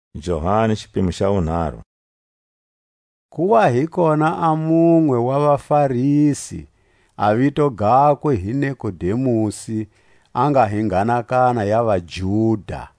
Nikodemusi. Ku wa hi kona a munwe wa vaFarisi, a vito gakwe hi Nikodemusi, a nga hi nghanakana ya vaJuda.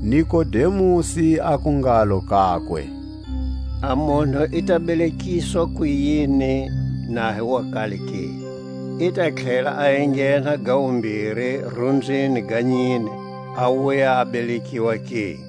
Nikodemusi aku ngalo kakwe: A munhu i ta belekiswa kuyini na hi wa kale ke? I ta tlhela a enghena ga wumbiri rumbyini ga nyine, a wuya a belekiwa ke?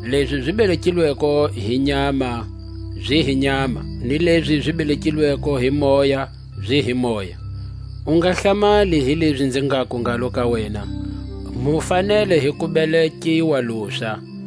Lezi zi belekilweko hi nyama zi hi nyama; ni lezi zi belekilweko hi Moya zi hi moya. U nga hlamali hi lezi nzi ngaku ngalo ka wena: Mu fanele hi ku belekiwa luswa.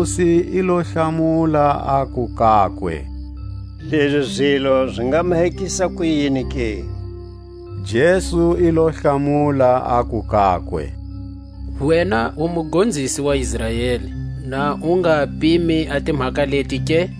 Nikodemusi i lo hlamula, aku kakwe: Lezi zilo zi nga mahekisa kuyini ke? Jesu i lo hlamula, aku kakwe: Wena u mugonzisi wa Israeli, na u nga pimi a timhaka leti ke?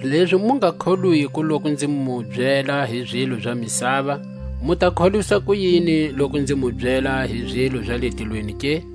Lezi mu nga kholwiko loku nzi mu byela hi zilo za misava, mu ta kholwisa kuyini loku nzi mu byela hi zilo za le tilweni ke?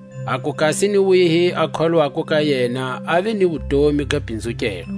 aku kasi ni wihi a kholwako, ka yena ave ni wutomi ga pinzukelwa.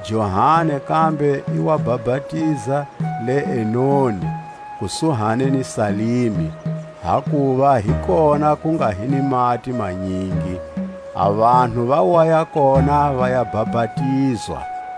Johani kambe i wa bapatiza le Enoni, kusuhi ni Salimi, hakuva hi kona ku nga hi ni mati manyingi; a vanhu va waya kona va ya bapatizwa.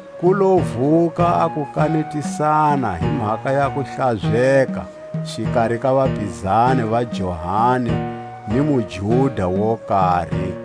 Ku lo vuka a kukanetisana hi mhaka ya kuhlazeka, xikari ka vapizani va Johani ni muJuda wo kari.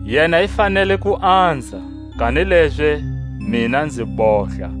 Yena i fanele ku anza, kanilezi mina nzi bohla.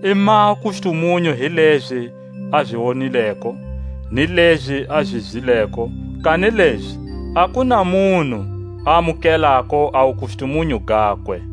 I maha wukustumunyu hi lezi a zi wonileko ni lezi a zi zwileko; kanilezi a ku na munhu a amukelako a wukustumunyu gakwe.